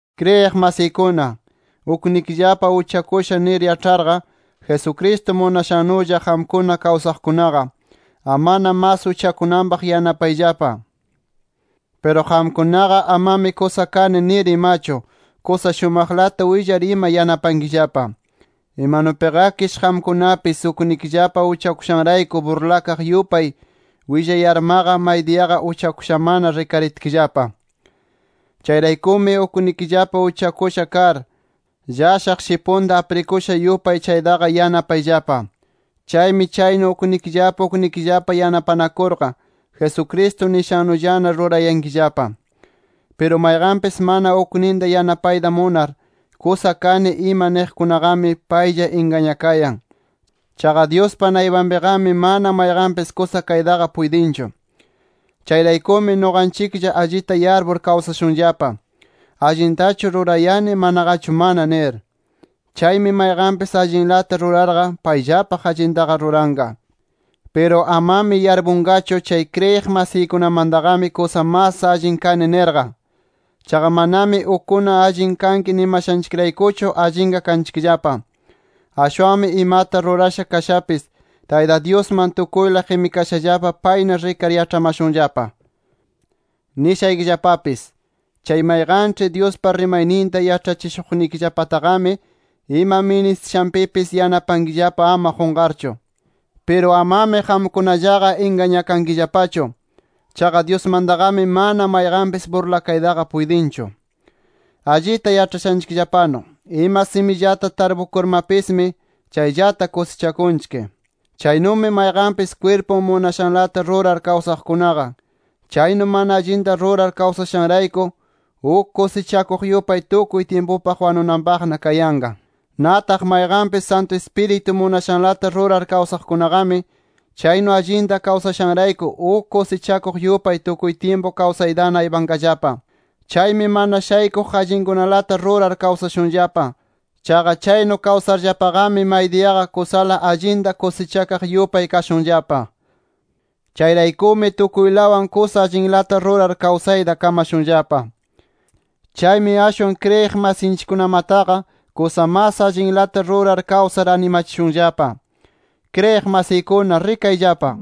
Kriyiq masiykuna, uknikillapa uchakusha nir yaĉharqa, Jesucristo munashannulla qamkuna kawsaqkunaqa, amana mas uchakunanpaq yanapayllapa. Piru qamkunaqa amami kusa kani nir imachu, kusa shumaqlata willar ima yanapankillapa. Imanupiqakish qamkunapis uknikillapa uchakushanrayku burlakaq yupay willayarmaqa, maydiyaqa uchakushamana rikaritkillapa. Chayraykumi uknikillapa uchakusha kar, llashaq shipunta aprikusha yupay chaytaqa yanapayllapa. Chaymi chaynu uknikillapa uknikillapa yanapanakurqa, Jesucristo nishannullana rurayankillapa. Piru mayqanpis mana ukninta yanapayta munar, kusa kani ima niqkunaqami, paylla ingañakayan. Chaqa Dyuspa naypanpiqami mana mayqanpis kusa kaytaqa puytinchu. Chayraykumi nuqanchiklla allita yarpur kawsashunllapa: Allintachu rurayani, manaqachu mana nir. Chaymi mayqanpis allinlata rurarqa, payllapaq allintaqa ruranqa. Piru amami yarpunqachu, chay kriyiq masiykunamantaqami kusa mas allin kani nirqa. Chaqa manami ukkuna allin kanki nimashanchikraykuchu allinqa kanchikllapa. Ashwanmi imata rurasha kashapis, Tayta Dyusman tukuyla qimikashallapa payna rikar yaĉhamashunllapa. Nishaykillapapis: Chay mayqanĉhi Dyuspa rimayninta yaĉhachishuqnikillapataqami, ima ministishanpipis yanapankillapa ama qunqarchu. Piru amami qamkunallaqa ingañakankillapachu. Chaqa Dyusmantaqami mana mayqanpis burlakayta puytinchu. Allita yaĉhashanchikllapanu, ima simillata tarpukurmapismi, chayllata kusichakunchik. Chaynumi mayqanpis kwirpun munashanlata rurar kawsaqkunaqa, chaynu mana allinta rurar kawsashanrayku, uk kusichakuq yupay tukuy tyimpupaq wanunanpaqna kayanqa. Nataq mayqanpis Santu Ispiritu munashanlata rurar kawsaqkunaqami, chaynu allinta kawsashanrayku, uk kusichakuq yupay tukuy tyimpu kawsaytana aypanqallapa. Chaymi mana shaykuq allinkunalata rurar kawsashunllapa. Chaqa chaynu kawsarllapaqami, maydiyaqa kusala allinta kusichakaq yupay kashunllapa. Chayraykumi tukuylawan kusa allinlata rurar kawsayta kamashunllapa. Chaymi ashwan kriyiq masinchikkunamataqa, kusa mas allinlata rurar kawsar animachishunllapa. ¡Kriyiq masiykuna, rikayllapa!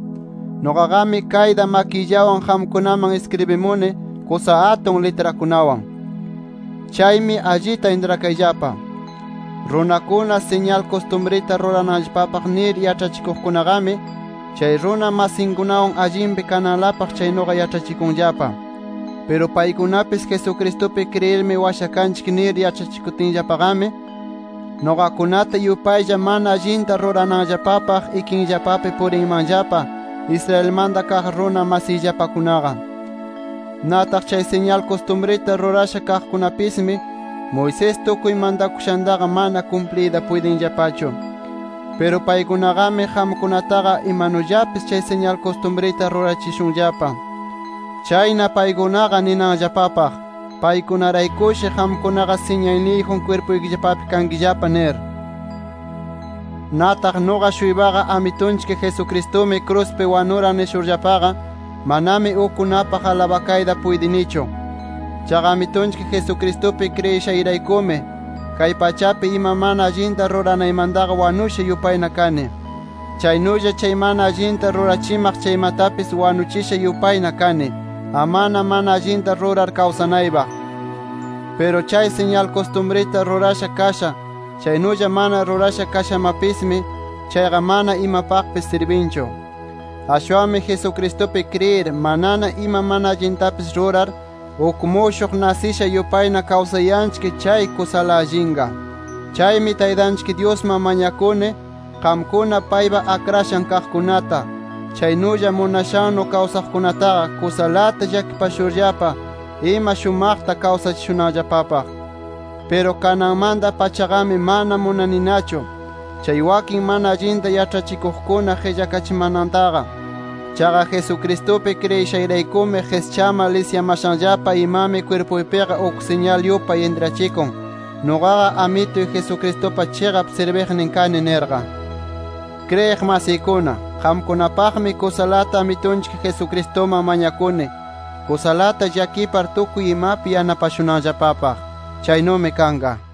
¡Nuqaqami kayta makiyllawan qamkunaman iskribimuni kusa atun litrakunawan! Chaymi allita intrakayllapa: Runakuna siñal kustumrita rurananllapapaq nir yaĉhachikuqkunaqami, chay runa masinkunawan allinpi kananlapaq chaynuqa yaĉhachikunllapa. Piru paykunapis, Jesucristupi kriyirmi washakanchik nir yaĉhachikutinllapaqami, nuqakunata yupaylla mana allinta rurananllapapaq ikinllapapi purinmanllapa, Israelmanta kaq runa masiyllapakunaqa. Nataq chay siñal kustumrita rurasha kaqkunapismi, Moisés tukuy mantakushantaqa mana kumpliyta puytinllapachu. Piru paykunaqami qamkunataqa imanullapis chay siñal kustumrita rurachishunllapa. Chayna paykunaqa ninanllapapaq: Paykunaraykushi qamkunaqa siñalniyjun kwirpuykillapapi kankillapa nir. Nataq nuqa-shuypaqa, Amitunchik Jesucristumi kruspi wanuran nishurllapaqa, manami ukkunapaq alabakaytaqa puytinichu. Chaqa Amitunchik Jesucristupi kriyishayraykumi, kay pachapi ima mana allinta ruranaymantaqa wanusha yupayna kani. Chaynulla chay mana allinta rurachimaq chaymatapis wanuchisha yupayna kani, amana mana allinta rurar kawsanaypaq. Piru chay siñal kustumrita rurasha kasha, chaynulla mana rurasha kashamapismi, chayqa mana imapaqpis sirbinchu. Ashwanmi Jesucristupi kriyir, manana ima mana allintapis rurar, uk mushuq nasisha yupayna kawsayanchik chay kusala allinqa. Chaymi Taytanchik Dyusman mañakuni qamkuna paypa akrashan kaqkunata, chaynulla munashannu kawsaqkunataqa, kusalata llakipashurllapa ima shumaqta kawsachishunanllapapaq. Piru kananmanta-pachaqami mana munaninachu, chay wakin mana allinta yaĉhachikuqkuna qillakachimanantaqa. Chaqa Jesucristupi kriyishayraykumi qischamar lisyamashanllapa imami kwirpuypiqa uk siñal yupay intrachikun, nuqaqa Amituy Jesucristupa chiqap sirbiqnin kani nirqa. Kriyiq masiykuna, qamkunapaqmi kusalata Amitunchik Jesucristuman mañakuni, kusalata llakipar tukuy imapi yanapashunanllapapaq. Chaynumi kanqa.